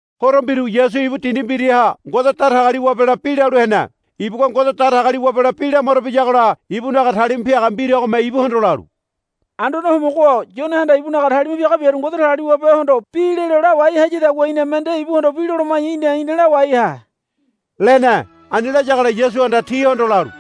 Horo mbiru Yasu ibu dindi mbiraha Ngode Datagaliwabela bi lalu hene. Ibugua Ngode Datagaliwabela bi lamaro biyagola ibunaga talima piaga mbiragome ibuhondo lalu, Anduane Homogo-o Yonehanda ibunaga talima piaga biaru Ngode Datagaliwabehondo bi lelo lawai hayadagua iname nde ibuhondo bi loloma̱ya í̠na ina lawai ha, lene. Ani layagola Yasuhanda tihondo lalu,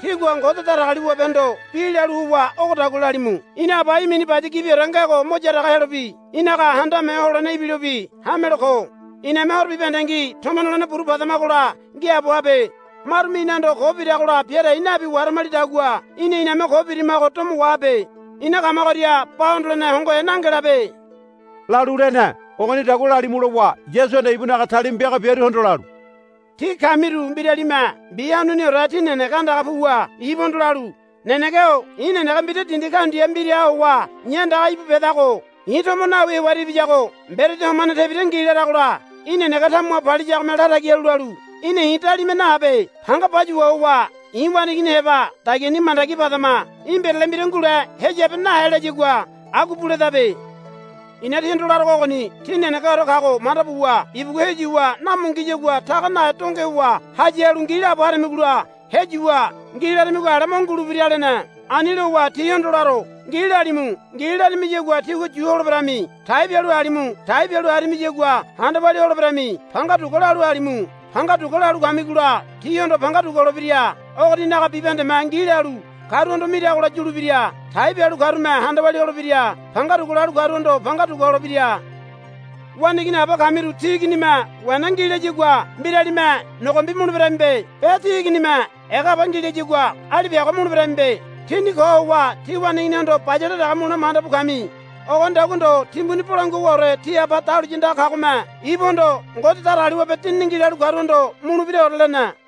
Tígua Ngode Datagaliwabehondo bi lalu howa ogodagua lalimu, Ina Aba í̠ mini baya gibiore ngego mo yaraga helobi í̠naga Handame Ho Holene ibilobi hamelo ko. Iname horo bibahendengi tomo nolene buru padamagola ngiaabo habe. Marume inahondo ko biragola bia dai nabi waharamalidagua í̠na iname ko birimago domo wahabe. Ina kamagoria ba hondolene hongohe nangelabe, lalu lene. Ogonidagua lalimu lowa Yasuhanda ibunaga talima piaga biaruhondo lalu, Tí kamiru mbiralime mbi hanuniore tí nenege andaga puwa ibuhondo lalu, Nenege-o i̱ nenege mbira dindi kaundia mbiraha howa i̱ andaga íbu bedago i̱ tomo nawi hewaria ibiyago mberedi homane tebira ngi, laragola í̠ nenege tamuha paliyagome latagi halu lalu, Í̠na i̱ dalima nahabe. Panga payuwa howa i̱ waneigini heba dagiani mandagi padama. Í̠ mbirale mbira ngule heyabe nahe, layagua agua buledabe. I̱na tíhondo larogo ogoni tí nenegeore kago manda buwa ibugua heyuwa namo ngiyagua taga nahe donge howa haya halu ngi laabo haramigola heyuwa ngi laramigo ale mo ngulebira, lene. Ani lowa, Tíhondo laro. Ngi, lalimu. Ngi, laramiyagua tígua yu holeberami. Tai bialu halimu. Tai bialu haramiyagua handa walia holeberami. Panga dugua, lalu halimu. Panga dugua, lalu kamigola tíhondo panga dugua holebira. Ogoninaga bibahendeme, Ngi, lalu karuhondo miragola yulebira. Tai bialu karume handa walia holebira. Panga dugua, lalu karuhondo panga dugua holebira. Waneigini aba kamiru tí iginime, Wena ngi, layagua mbiralime nogombi muleberamibe. Be tí iginime, Ega haba ngi, layagua alipiago muleberamibe. Tíni ko howa tí waneiginihondo bayale dege mulene manda bu kami. Ogonidagua ndo timbuni bolangua howaore tí Aba dahuliya andaga kagome ibuhondo, Ngode Datagaliwabe Dinini ngi, lalu karuhondo mulebiraore, lene.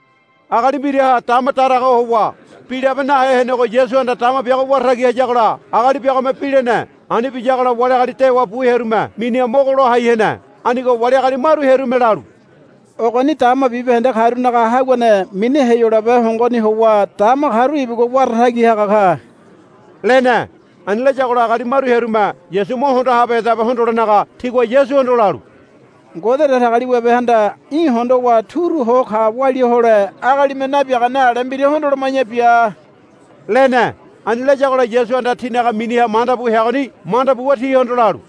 Agali mbiraha dama daraga ho howa bi labe nahe henego Yasuhanda dama biago wara tagi hayagola agali biagome bi lene. Ani biyagola wali agali dewa bu hearume miniha mogo lai ho hene. Anigo wali agali maru hearume lalu, Ogoni dama bibahende karunaga haguane mini Heyolabe hongoni howa dama karu ibugua wara tagi haga ka, lene. Ani layagola agali maru hearume Yasu mo hondo habehedabe hondolenaga tigua Yasuhondo lalu, Ngode Datagaliwabehanda í̠ hondowa turu ho ka walia hole agalime nabiagane ale mbira hondoloma̱ya bia, lene. Ani layagola Yasuhanda tinaga miniha manda bu heagoni manda buwa tihondo lalu,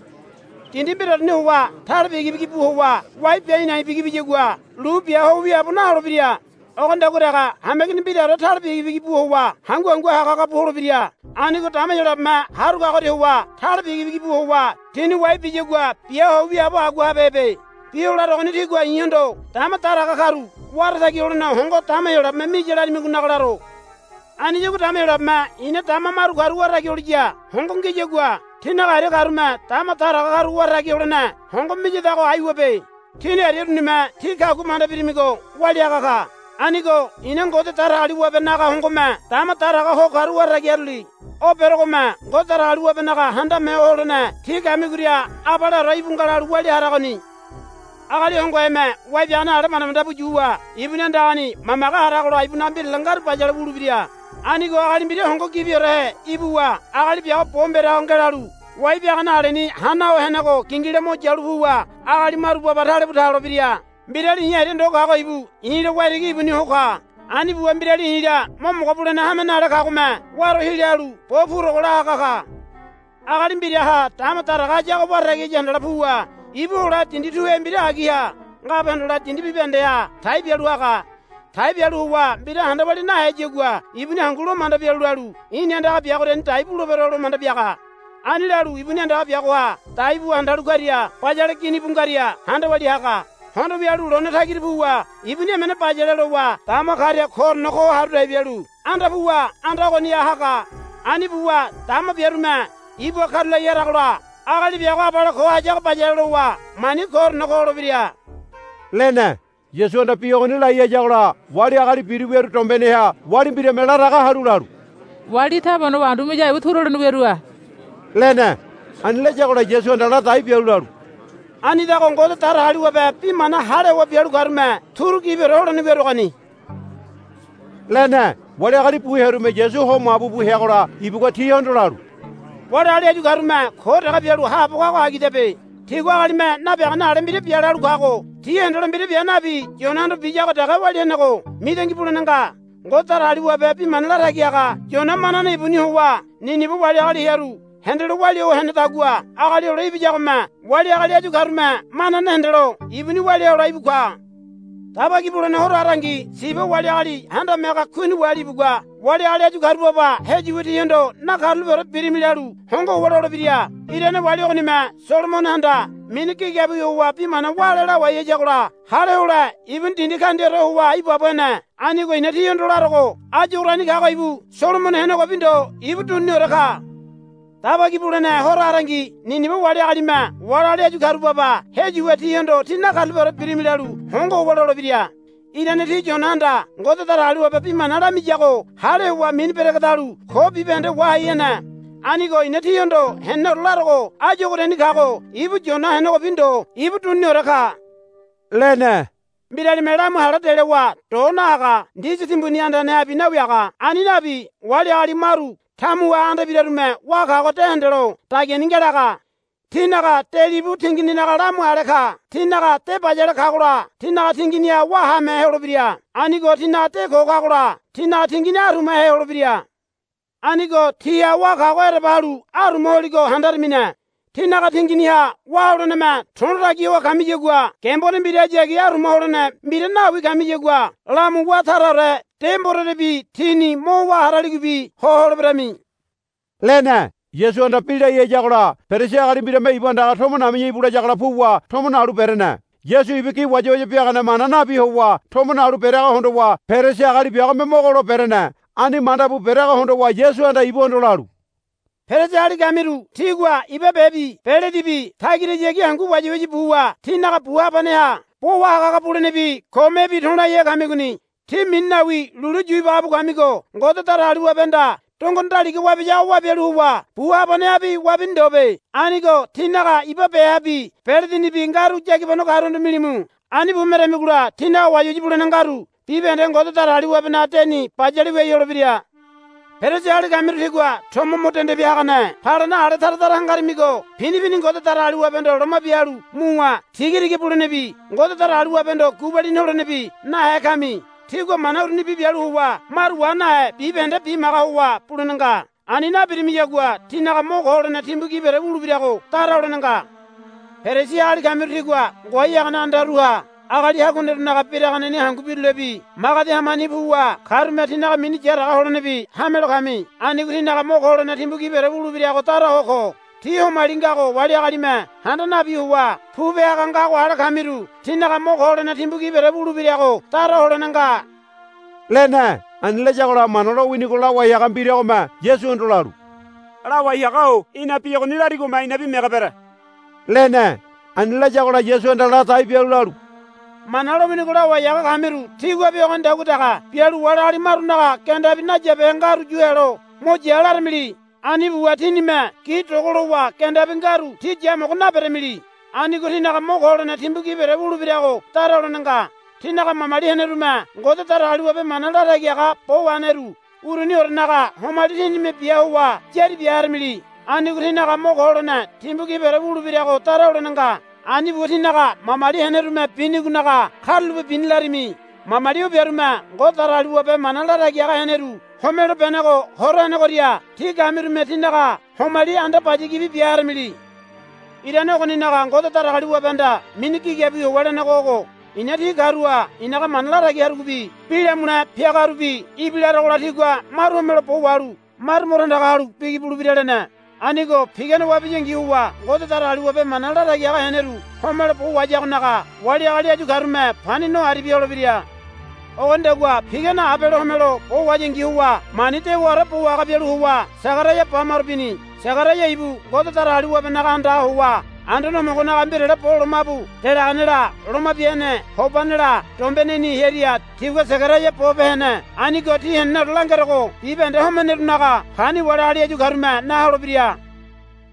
Dindi mbiraoreni howa tale bigi bigi bu howa wai bia a̱i̱ na̱i̱ bigi biyagua lu bia ho wiaabo naholebira. Ogonidagua dege hameigini mbiraore tale bigi bigi bu howa hangu hangu haga haga bu holebira. Anigo dama Heyolabeme haru kagoria howa tale bigi bigi bu howa tini wai biyagua bia ho wiaabo agua habehebe. Bi o larogoni tígua i̱hondo dama daraga karu wara tagi holene hongo dama Heyolabeme miya laramigonaga laro. Aniyagua dama Heyolabeme i̱na dama maru karu wara tagi holiya hongo ngiyagua tínaga aria karume dama daraga karu wara tagi holene hongo miyadago aiwabe. Tíni aria urunime tí kagua manda birimigo walia haga ka. Anigo i̱na Ngode Datagaliwabenaga hongome dama daraga ho karu wara tagi haruli. O berogome Ngode Datagaliwabenaga Handame Ho Holene tí kamigoria abaleore íbu nga lalu walia haragoni. Agali hongoheme wai biagane ale manda manda bu yuwa ibuni andagani mamage haragola ibunaga mbirale ngaru bayale wulebira. Anigo agali mbira hongo gibiorehe ibuwa agali biago bo mbera ho ngelalu wai biagane aleni hana ho henego gingila mo yalu puwa agali maru baba talebu ta holebira. Mbirali i̱ aria ndo kago ibu i̱la waitigi ibuni ho ka. Ani buwa mbirali i̱la mo mogo bulene hame nale kagome waro hila halu bo purogo la haga ka. Agali mbiraha dama daraga hayago wara tagi haya handala puwa ibu hole dindi tuhe mbira agiha ngabe hondole dindi bibahendeha tai bialu haga. Tai bialu howa mbira handa walia naheyagua ibuni hangu lo manda bialu lalu, I̱ni andaga biagoriani dai bulebero, lo manda biaga. Ani lalu ibuni andaga biagoha dai buwa handalu karia bayale gini bu ngaria handa walia haga. Hondo wialu lone tagira puwa ibuni emene bayale lowa dama karia koorene ko haru dai bialu anda puwa anda ogoniha haga. Ani buwa dama biarume ibuha karulai haragola agali biago abale ko hayago bayale lowa mani koorene ko holebira, lene. Yasuhanda bi ogoni lai hayagola wali agali biru wiaru dombeneha wali mbirame laraga halu lalu, Wali í̠ taba honowa andu miyago ibu turu holene wiarua, lene. Ani layagola Yasuhanda la dai bialu lalu, Anidago Ngode Datagaliwabe bi mana hale howa bialu karume turu gibiore holene wiaruagoni, lene. Wali agali bu hearume Yasu ho mabu bu heagola ibugua tihondo lalu, Wali agali áyu karume ko dege bialu haabo kago agidabe. Tigua agalime nabiagane ale mbira bia lalu kago ti hendelo mbira bia nabi Yonahondo biyago dege walia henego mitangi bulene nga. Ngode Datagaliwabe bi mana latagi haga Yona manane ibuni howa Nineba wali agali hearu hendelo walia ho henedagua Agali Hole Ibiyagome wali agali áyu karume manane hendelo ibuni walia hole íbu ka. Daba Ki Bulene Horo harangi Siba wali agali handame haga kuini wali ibugua wali agali áyu karu baba heyuwa tihondo, Nakarulapeore birimi, lalu hongo howa lolebira. Irane wali ogonime Solomonohanda mini gigabiwi howa bi mana wále lawai hayagola hale hole ibuni dindi kaundiaore howa ibaabo hene. Anigo i̱na tíhondo larogo áyu ogoriani kago ibu Solomono henegobi ndo ibu duniniore ka. Daba Ki Bulene Horo harangi Niniba wali agalime wali agali áyu karu baba heyuwa tihondo, Tí nakarulapeore birimi, lalu hongo howa lolebira. Irane ti Yonahanda Ngode Datagaliwabe bi mana lamiyago hale howa mini beregedalu ko bibahende wahai hene. Anigo i̱na tíhondo heneneore larogo áyu ogoriani kago ibu Yona henegobi ndo ibu duniniore ka, lene. Mbiralime lamu hale delowa do nahaga ndisi timbuni andanehabi nawiaga. Ani nabi wali agali maru tamuha anda ibirarume wá kago de hendelo dagiani ngelaga. Tínaga de libu tingininaga lamu ale ka. Tínaga de bayale kagola tínaga tinginiha wá haamehe holebira. Anigo tínaga de ko kagola tínaga tingini arumahe holebira. Anigo tíha wá kago ereba halu aruma holigo handaramine. Tínaga tinginiha wá holeneme to̱lo tagi ho kamiyagua gembone mbirahayagi aruma holene mbira nawi kamiyagua lamu wá taraore de mborerebi tíni mo wá haraligobi ho holeberami, lene. Yasuhanda bi lai hayagola Perisi agali mbirame ibu andaga, Tomo nabiya íbu, layagola puwa tomo nalu berene. Yasu ibu gi wayawaya biagane mana nabi howa tomo nalu bereago hondowa Perisi agali biagome mogo lo berene. Ani manda bu bereago hondowa Yasuhanda ibuhondo lalu, Perisi agali kamiru tígua iba bebi beledibi tagirahayagi hangu wayawaya buwa tínaga bu habaneha bo wahaga haga bulenebi komebi to̱laihe kamigoni. Tí mini nawi lulu yu ibaga bu kamigo Ngode Datagaliwabehanda dongone daliga wabiyago wabialu howa bu habanehabi wabini ndobe. Anigo tínaga iba behabi beledinibi ngaru yagibano karuhondo milimu. Ani bu meramigola tínaga wayawaya bulene ngaru bibahende Ngode Datagaliwabenaga deni bayale wiai holebira. Perisi agali kamiru tígua tomo mo dende bia hagane palena ale tara tara hangarimigo pini pini Ngode Datagaliwabehondo loma bia halu muwa tigatiga bulenebi Ngode Datagaliwabehondo gubalini holenebi nahe kami. Tígua mana urunibi bialu howa maru wa nahe bibahende bimaga howa bulene nga. Ani nabirimiyagua tínaga mo ko holene timbu gibiore wulebirago dara holene nga. Perisi agali kamiru tígua ngoai hagane andaruha agali haguanerunaga biraganeni hangu birulebi magedi hamani puwa karume tínaga mini yaraga holenebi hame lo kami. Anigo tínaga mo ko holene timbu gibiore wulebirago dara ho ko. Tí homali ngago wali agalime handa nabi howa pupe haga ngago ale kamiru tínaga mo ko holene timbu gibiore wulebirago dara holene nga, lene. Ani layagola Mana lowinigo lawai haga mbiragome Yasuhondo lalu, Lawai haga-o í̠na bi ogoni larigome inabi mege bere, lene. Ani layagola Yasuhanda la dai bialu lalu, Mana lowinigo lawai haga kamiru tíguabi ogonidagua dege bialu wali agali marunaga gendabi nayabehe ngaru yu helo, Mo ya, laramili. Ani buwa tínime gi dogo lowa gendabi ngaru ti yamogo naberamili. Anigo tínaga mo ko holene timbu gibiore wulebirago dara holene nga. Tínaga mamali henerume Ngode Datagaliwabe mana latagi haga bo waheneru uruniorenaga homali tínime bia howa yari bia haramili. Anigo tínaga mo ko holene timbu gibiore wulebirago dara holene nga. Ani buwa tínaga mamali henerume binigonaga, Karulape bini, larami. Mamali o biarume Ngode Datagaliwabe mana latagi haga heneru homelo benego hora henegoria tí kamirume tinaga homali anda baya gibi bia haramili. Irane ogoninaga Ngode Datagaliwabehanda mini Gigabiwi howa lenego ogo, I̱na ti karuha i̱naga mana latagi hagarubi bi lamule piagarubi ibilarogola tigua maru homelo bo wahalu maru mo tandaga halu bigi bulebira, lene. Anigo pigane wabiyangi howa Ngode Datagaliwabe mana latagi haga heneru homelo bo wahayagonaga wali agali áyu karume pani no aribia holebira. Ogonidagua pigane Abele homelo bo wahayangi howa mani dewaore bo wahaga bialu howa Segaraia ba maro bini. Segaraia ibu Ngode Datagaliwabenaga andaha howa Anduane Homogonaga mbirale bo lomabu delaganela Loma Bia Hene Hobanela dombeneni hearia tigua Segaraia bo pe hene. Anigo tí heneneore langerogo bibahende homenerunaga pani wali agali áyu karume na holebira.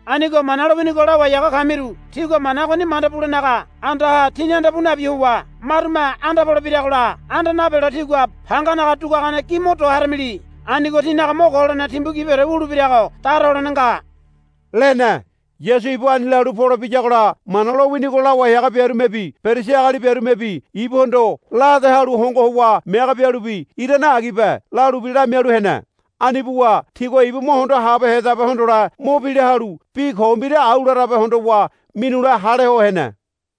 Anigo Mana lowinigo lawai haga kamiru tígua mana ogoni manda bulenaga andaha tíni anda pu nabi howa marume anda pole biragola anda napelo tígua panganaga duguagane gi mo do haramili. Anigo tínaga mo ko holene timbu gibiore wulebirago dara holene nga, lene. Yasu ibu ani lalu pole biyagola Mana lowinigo lawai haga biarumebi Perisi agali biarumebi ibuhondo la ade halu hongo howa mege bialubi, Irane agibe, lalubi lamialu hene. Ani buwa tigua ibu mo hondo habehedabe hondole mo bila halu bi ko mbira au larabe hondowa minule hale ho hene.